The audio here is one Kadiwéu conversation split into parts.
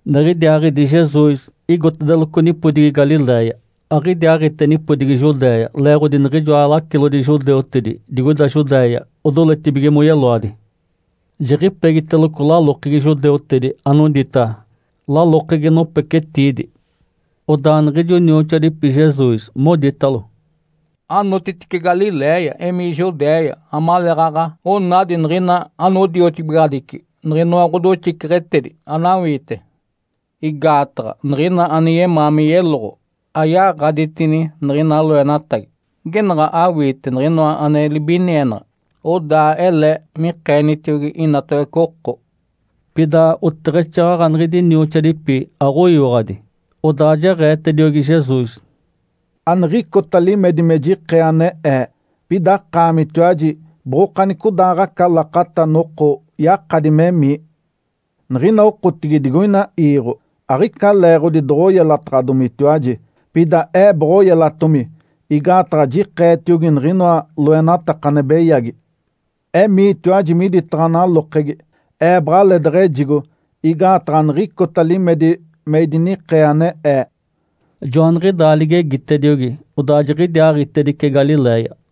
Niɡ̶idiaaɡ̶idi Jesus igotedeloco nipodigi Galiléia. Aɡ̶idiaaɡ̶ite nipodigi Judéia, leeɡ̶odi niɡ̶ijoa lacilodi judeutedi digoida Judéia odoletibige moyeloadi. Jiɡ̶ipegiteloco lalokegi judeutedi, anodita “Lalokegi nopecetiidi”. Odaa niɡ̶ijo nioxoadipi Jesus moditalo, “Anotitice Galiléia, emii Judéia amaleeɡ̶aɡ̶a onadi niɡ̶ina anodiotibigaɡ̶adici niɡ̶inoa ɡ̶odoxiceɡ̶etedi anawiite. Igaataɡ̶a niɡ̶ina ane yemaa me yeloɡ̶o, ayaɡ̶aditini niɡ̶ina loenatagi. Genaɡ̶a awiite niɡ̶inoa ane libinienaɡ̶a, odaa ele mikeenitiogi inatawece oko”. Pida oteɡ̶exaaɡ̶aɡ̶a niɡ̶idi nioxoadipi aɡ̶oyiwaɡ̶adi. Odaa jeɡ̶eetediogi Jesus, “Aniɡ̶icota limedi me jikee ane Ee. Pida akaamitiwaji boɡ̶okanicodaaɡ̶aca lakata noko yakadi memii. Niɡ̶ina okotigi digoina iiɡ̶o aɡ̶ica leeɡ̶odi doɡ̶oyelataɡ̶adomitiwaji, pida Ee boɡ̶oyelatomi. Igaataɡ̶a jikeetiogi niɡ̶inoa loenataka ane beyagi. Emiitiwaji miditaɡ̶a nalokegi. Ee baɡ̶aleedeɡ̶ejigo igaataɡ̶a aniɡ̶icota limedi me idinikee ane Ee”. Joaniɡ̶idaa ligegitediogi, odaa jiɡ̶idiaaɡ̶itedice Galiléia.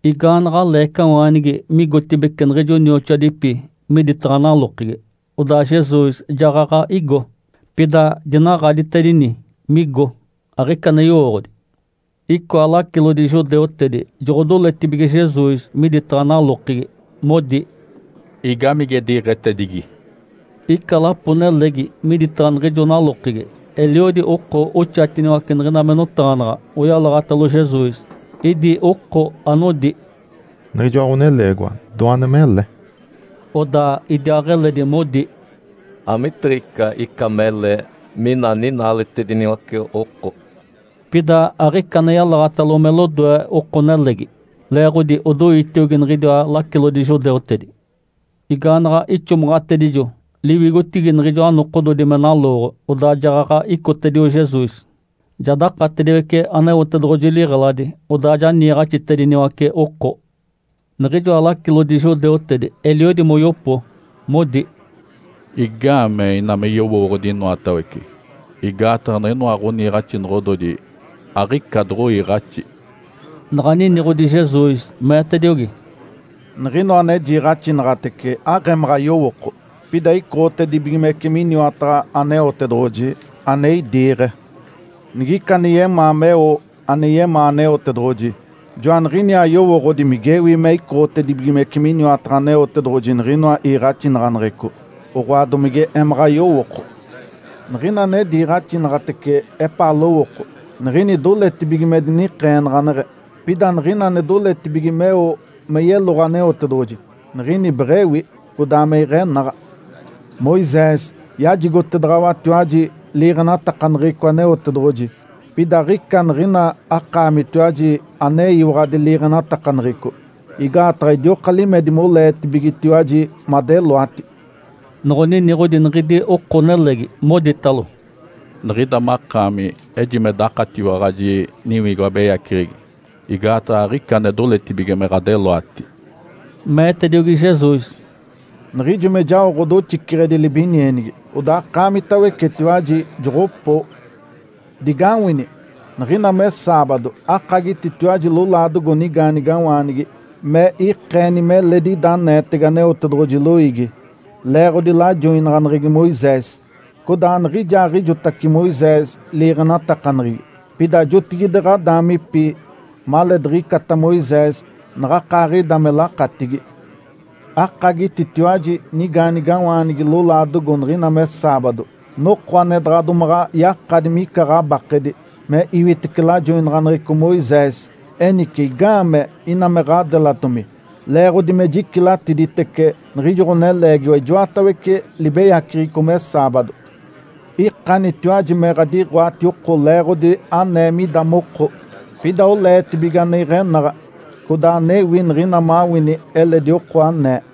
Igaanaɡ̶a leecawaanigi migotibeci niɡ̶ijo nioxoadipi miditaɡ̶a nalokegi, odaa Jesus jaɡ̶aɡ̶a igo. Pida dinaɡ̶aditedini migo, aɡ̶ica ane yowooɡ̶odi. Icoa lacilodi judeutedi joɡ̶odoletibige Jesus miditaɡ̶a nalokegi. Modi, “Igamige diɡ̶etedigi?” Ica lapo-nelegi miditaɡ̶a niɡ̶ijo nalokegi, eliodi oko oxatiniwace niɡ̶ina me notaɡ̶anaɡ̶a oyalaɡ̶atalo Jesus. Idi oko anodi, “Niɡ̶ijoa ɡ̶oneleegiwa doane mele”. Odaa idiaaɡ̶eledi modi, “Amitiɡ̶ica ica mele, mina ninaaletediniwace oko”. Pida aɡ̶ica ane yalaɡ̶atalo me lodoe oko-nelegi, leeɡ̶odi odoitiogi niɡ̶idiwa lacilodi judeutedi. Igaanaɡ̶a ixomaɡ̶atedijo liwigotigi niɡ̶ijoa nokododi me nalooɡ̶o, odaa jaɡ̶aɡ̶a icotedio Jesus, ja dakatediwece Aneotedoɡ̶oji liɡ̶eladi, odaa ja niiɡ̶axitediniwace oko. Niɡ̶ijoa lacilodi judeutedi eliodi moyopo, modi, “Igaamee ina me yowooɡ̶odi inoatawece? Igaataɡ̶a niɡ̶inoa ɡ̶oniiɡ̶axinoɡ̶ododi aɡ̶ica doɡ̶oiiɡ̶axi”. Naɡ̶a niniɡ̶odi Jesus, meetediogi, “Niɡ̶inoa ane jiiɡ̶axinaɡ̶atece aɡ̶emaɡ̶a yowooko, pida icoɡ̶otedibigimece miniwataɡ̶a Aneotedoɡ̶oji, ane idiiɡ̶e. Nigica ane yemaa meo ane yemaa Aneotedoɡ̶oji, joaniɡ̶iniaa yowooɡ̶odi migewi me icoɡ̶otedibigimece miniwataɡ̶a Aneotedoɡ̶oji niɡ̶inoa iiɡ̶axinaɡ̶aneɡ̶eco, oɡ̶oa domige emaɡ̶a yowooko. Niɡ̶ina ane diiɡ̶axinaɡ̶atece epaa lowooko, niɡ̶ini doletibige me dinikeenaɡ̶aneɡ̶e. Pida niɡ̶ina ane doletibige meo me yeloɡ̶o Aneotedoɡ̶oji, niɡ̶ini beɡ̶ewi, codaa me iɡ̶enaɡ̶a. Moisés yajigotedaɡ̶awatiwaji liiɡ̶enatakaneɡ̶eco Aneotedoɡ̶oji. Pida aɡ̶ica niɡ̶ina akaamitiwaji aneyiwaɡ̶adi liiɡ̶enatakaneɡ̶eco. Igaataɡ̶a idioka limedi moleetibigetiwaji madeloati.” Noɡ̶oniniɡ̶odi niɡ̶idi oko-nelegi, moditalo, “Niɡ̶ida makaami ejime dakatiwaɡ̶aji niwigo abeyaceɡ̶egi. Igaataɡ̶a aɡ̶ica ane doletibige me ɡ̶adeloati”. Meetediogi Jesus, “Niɡ̶ijo me jao ɡ̶odoxiceɡ̶edi libinienigi, odaa akaamitawecetiwaji joɡ̶opoo. Digawini! Niɡ̶ina me saabado akagititiwaji lolaadogo nigaanigawaanigi me ikeeni meledi ida aneetege Aneotedoɡ̶oji loiigi, leeɡ̶odi lajoinaɡ̶aneɡ̶egi Moisés. Codaa aniɡ̶ijaaɡ̶ijotace Moisés liiɡ̶enatakaneɡ̶egi, pida jotigide ɡ̶adaamipi maleediɡ̶icata Moisés naɡ̶akaaɡ̶ida me lakatigi. Akagititiwaji nigaanigawaanigi lolaadogo niɡ̶ina me saabado, noko ane daɡ̶a domaɡ̶a yakadi mica ɡ̶abakedi, me iwitece lajoinaɡ̶aneɡ̶eco Moisés. Enice, igaamee ina me ɡ̶adelatomi, leeɡ̶odi me jicilatiditece niɡ̶ijo ɡ̶oneleegiwa ijoatawece libeyaceɡ̶eco me saabado? Ikanitiwaji me ɡ̶adiɡ̶oati oko leeɡ̶odi anee mida moko, pida oleetibige ane iɡ̶enaɡ̶a codaa anewi niɡ̶ina mawini eledi oko anee.”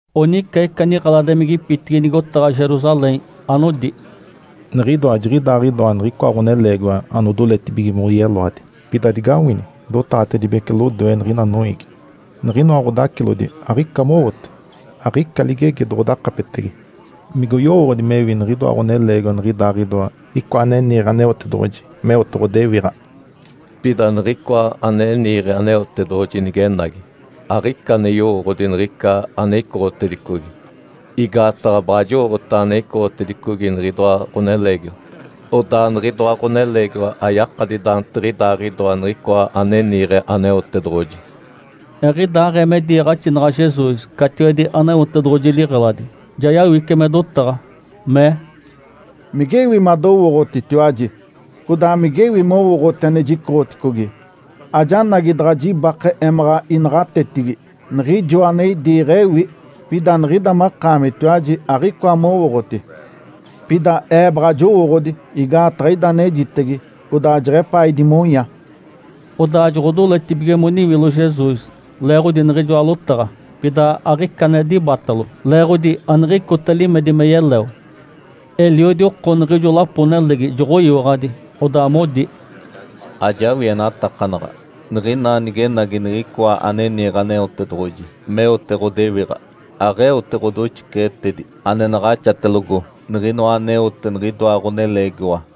Onica ica niɡ̶eladimigipitigi nigotaɡ̶a Jerusalém, anodi, “Niɡ̶idoa jiɡ̶idaaɡ̶idoa niɡ̶icoa ɡ̶oneleegiwa anodoletibige moyeloadi. Pida digawini! Dotaɡ̶atedibece lodoe niɡ̶ina noiigi, niɡ̶inoa ɡ̶odacilodi aɡ̶ica mowote, aɡ̶ica ligegi doɡ̶odakapetege. Migoyowooɡ̶odi mewi niɡ̶idoa ɡ̶oneleegiwa niɡ̶idaaɡ̶idoa Icoa ane niiɡ̶e Aneotedoɡ̶oji meote ɡ̶odewiɡ̶a? Pida Niɡ̶icoa ane niiɡ̶e Aneotedoɡ̶oji nigenagi, aɡ̶ica ane yowooɡ̶odi niɡ̶ica ane icoɡ̶otedicogi. Igaataɡ̶a baɡ̶a jowooɡ̶otaɡ̶a ane icoɡ̶otedicogi niɡ̶idoa ɡ̶oneleegiwa. (Odaa niɡ̶idoa ɡ̶oneleegiwa ayakadi daantiɡ̶idaaɡ̶idoa Niɡ̶icoa ane niiɡ̶e Aneotedoɡ̶oji.)” Eɡ̶idaaɡ̶ee me diiɡ̶axinaɡ̶a Jesus catiwedi Aneotedoɡ̶oji liɡ̶eladi, ja yawice me dotaɡ̶a, mee, “Migewi madowooɡ̶otitiwaji, codaa migewi mowooɡ̶oti ane jicoɡ̶oticogi? Ajanagi daɡ̶a jibake emaɡ̶a inaɡ̶atetigi. Niɡ̶ijoa ane idiiɡ̶e ewi. Pida niɡ̶ida makaamitiwaji aɡ̶icoa mowooɡ̶oti. Pida Ee baɡ̶a jowooɡ̶odi, igaataɡ̶a ida anejitege, codaa jeɡ̶epaa idimonya”. Odaa joɡ̶odoletibige moniwilo Jesus, leeɡ̶odi niɡ̶ijoa lotaɡ̶a. Pida aɡ̶ica ane dibatalo, leeɡ̶odi aniɡ̶icota limedi me yeleo. Eliodi oko niɡ̶ijo lapo-nelegi joɡ̶oyiwaɡ̶adi. Odaa modi, “Ajawienatakanaɡ̶a niɡ̶ina nigenagi Niɡ̶icoa ane niiɡ̶e Aneotedoɡ̶oji meote ɡ̶odewiɡ̶a, aɡ̶eote ɡ̶odoxiceɡ̶etedi ane naɡ̶axatelogo niɡ̶inoa aneote niɡ̶idoa ɡ̶oneleegiwa.”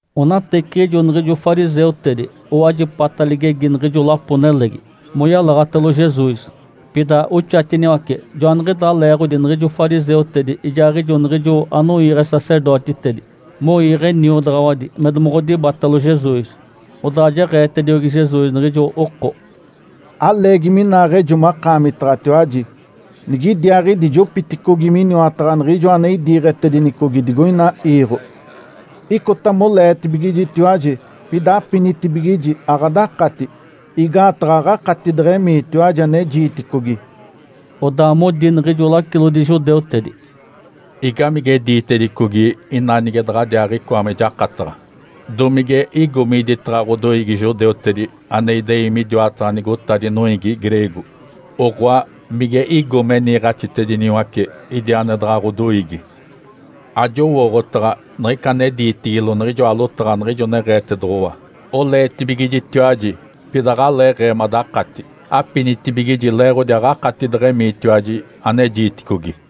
Onateciɡ̶ijo niɡ̶ijo fariseutedi owajipata ligegi niɡ̶ijo lapo-nelegi moyalaɡ̶atalo Jesus, pida oxatiniwace. Joaniɡ̶idaa leeɡ̶odi niɡ̶ijo fariseutedi ijaaɡ̶ijo niɡ̶ijo anoiiɡ̶e sacerdotitedi moiiɡ̶e niodaɡ̶awadi me domoɡ̶odibatalo Jesus. Odaa jeɡ̶eetediogi Jesus niɡ̶ijo oko, “Aleegi minaaɡ̶ejo makaamitaɡ̶atiwaji. Nigidiaaɡ̶idi jopiticogi miniwataɡ̶a Niɡ̶ijoa ane idiiɡ̶etedinicogi digoina iiɡ̶o. Icota moleetibigijitiwaji, pida apinitibigiji aɡ̶adakati, igaataɡ̶a aɡ̶akati deɡ̶emiitiwaji ane jiiticogi”. Odaa modi niɡ̶ijo lacilodi judeutedi, “Igamige diitedicogi ina nige daɡ̶adiaaɡ̶icoa me jakataɡ̶a? Domige igo miditaɡ̶a ɡ̶odoiigi judeutedi ane idei midiwataɡ̶a nigotadi noiigi greego? Oɡ̶oa, mige igo me niiɡ̶axitediniwace idi ane daɡ̶a ɡ̶odoiigi? Ajowooɡ̶otaɡ̶a niɡ̶ica ane diitigilo niɡ̶ijoa lotaɡ̶a niɡ̶ijo neɡ̶eetedoɡ̶owa, ‘Oleetibigijitiwaji, pida aɡ̶aleeɡ̶ee madakati, apinitibigiji leeɡ̶odi aɡ̶akati deɡ̶emiitiwaji ane jiiticogi’.”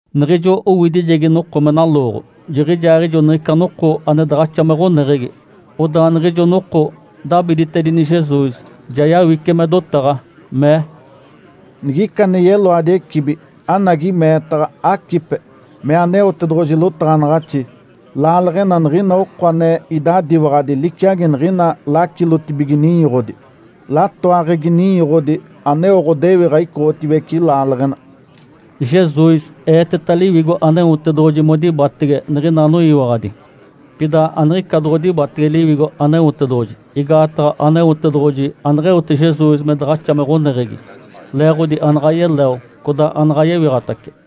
Niɡ̶ijo owidijegi noko me nalooɡ̶o, jiɡ̶ijaaɡ̶ijo niɡ̶ica noko ane daɡ̶axa me ɡ̶oneɡ̶egi. Odaa niɡ̶ijo noko dabiditedini Jesus, ja yawice me dotaɡ̶a, mee, “Nigica ane yeloadi ecibi, anagi meetaɡ̶a, acipe! Mee Aneotedoɡ̶oji lotaɡ̶anaɡ̶axi, ‘Laaleɡ̶ena niɡ̶ina oko ane idadiwaɡ̶adi liciagi niɡ̶ina lacilotibige ninyoɡ̶odi. Latoaɡ̶egi ninyoɡ̶odi aneo ɡ̶odewiɡ̶a icoɡ̶otiwece laaleɡ̶ena’”. Jesus eeteta Liwigo Aneotedoɡ̶oji modibatege niɡ̶ina anoyiwaɡ̶adi. Pida aniɡ̶ica doɡ̶odibatege Liwigo Aneotedoɡ̶oji, igaataɡ̶a Aneotedoɡ̶oji aneɡ̶eote Jesus me daɡ̶axa me ɡ̶oneɡ̶egi, leeɡ̶odi anaɡ̶a yeleo codaa anaɡ̶a yewiɡ̶atace.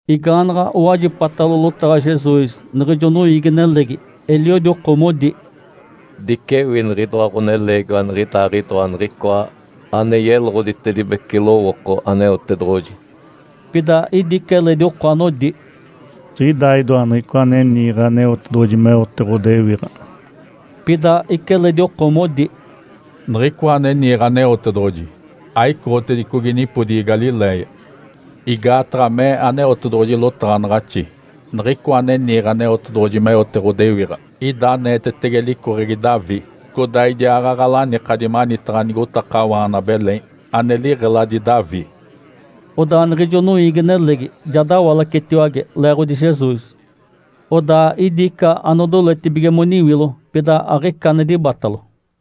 Igaanaɡ̶a owajipatalo lotaɡ̶a Jesus niɡ̶ijo noiigi-nelegi, eliodi oko modi, “Dicewi niɡ̶idoa ɡ̶oneleegiwa niɡ̶idaaɡ̶idoa niɡ̶icoa ane yeloɡ̶oditedibece lowooko Aneotedoɡ̶oji”. Pida idi ica eledi oko anodi, “Jiɡ̶idaaɡ̶idoa Niɡ̶icoa ane niiɡ̶e Aneotedoɡ̶oji meote ɡ̶odewiɡ̶a”. Pida ica eledi oko modi, “Niɡ̶icoa ane niiɡ̶e Aneotedoɡ̶oji aicoɡ̶otedicogi nipodigi Galiléia. Igaataɡ̶a mee Aneotedoɡ̶oji lotaɡ̶anaɡ̶axi, ‘Niɡ̶icoa ane niiɡ̶e Aneotedoɡ̶oji meote ɡ̶odewiɡ̶a ida aneetetege licoɡ̶egi Davi, codaa idiaaɡ̶aɡ̶a lanikadi manitaɡ̶a nigotakawaana Belém, ane liɡ̶eladi Davi’”. Odaa niɡ̶ijo noiigi-nelegi ja dawalacetiwage leeɡ̶odi Jesus. Odaa idi ica anodoletibige moniwilo, pida aɡ̶ica ane dibatalo.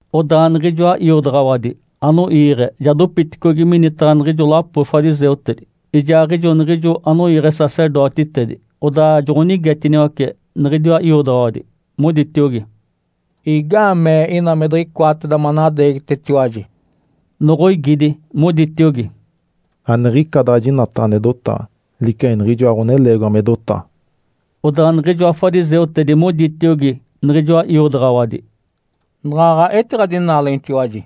Odaa niɡ̶ijoa iodaɡ̶awadi anoiiɡ̶e ja dopiticogi minitaɡ̶a niɡ̶ijo lapo fariseutedi ijaaɡ̶ijo niɡ̶ijo anoiiɡ̶e sacerdotitedi. Odaa joɡ̶onigetiniwace niɡ̶idiwa iodaɡ̶awadi, moditiogi, “Igaamee ina me diɡ̶icoateda manadeegitetiwaji?” Noɡ̶oigidi, moditiogi, “Aniɡ̶ica daɡ̶a jinataɡ̶a ane dotaɡ̶a liciagi niɡ̶ijoa ɡ̶oneleegiwa me dotaɡ̶a”. Odaa niɡ̶ijoa fariseutedi moditiogi niɡ̶ijoa iodaɡ̶awadi, “Naɡ̶aɡ̶a etiɡ̶adinaalenitiwaji?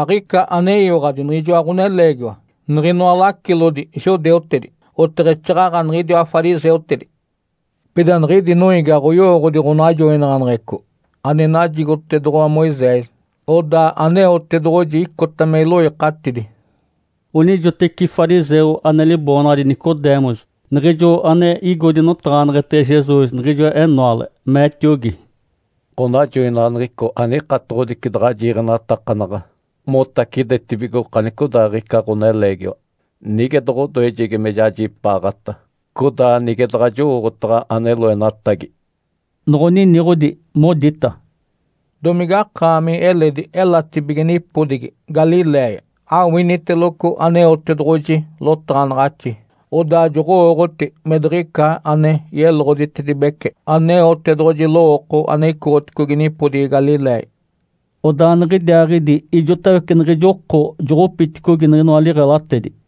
Aɡ̶ica aneyiwaɡ̶adi niɡ̶ijoa ɡ̶oneleegiwa niɡ̶inoa lacilodi judeutedi, oteɡ̶exaaɡ̶aɡ̶a niɡ̶idiwa fariseutedi. Pida niɡ̶idi noiigi aɡ̶oyowooɡ̶odi ɡ̶onajoinaɡ̶aneɡ̶eco ane najigotedoɡ̶owa Moisés, odaa Aneotedoɡ̶oji icota me iloikatidi”. Onijoteci fariseu ane liboonaɡ̶adi Nicodemus, niɡ̶ijo ane igo dinotaɡ̶aneɡ̶etege Jesus niɡ̶ijo enoale, meetiogi, “Ǥonajoinaɡ̶aneɡ̶eco anikatoɡ̶odici daɡ̶a jiiɡ̶enatakanaɡ̶a motacidetibigo okanicodaaɡ̶ica ɡ̶oneleegiwa nige doɡ̶odoejegi me jajipaaɡ̶ata, codaa nige daɡ̶a jowooɡ̶otaɡ̶a ane loenatagi”. Noɡ̶oniniɡ̶odi, modita, “Domige akaami eledi elatibige nipodigi Galiléia? Awiniteloco Aneotedoɡ̶oji lotaɡ̶anaɡ̶axi, odaa joɡ̶owooɡ̶oti me diɡ̶ica ane yeloɡ̶oditedibece Aneotedoɡ̶oji lowooko ane icoɡ̶oticogi nipodigi Galiléia.” Odaa niɡ̶idiaaɡ̶idi ijotawece niɡ̶ijo oko joɡ̶opiticogi niɡ̶inoa liɡ̶elatedi.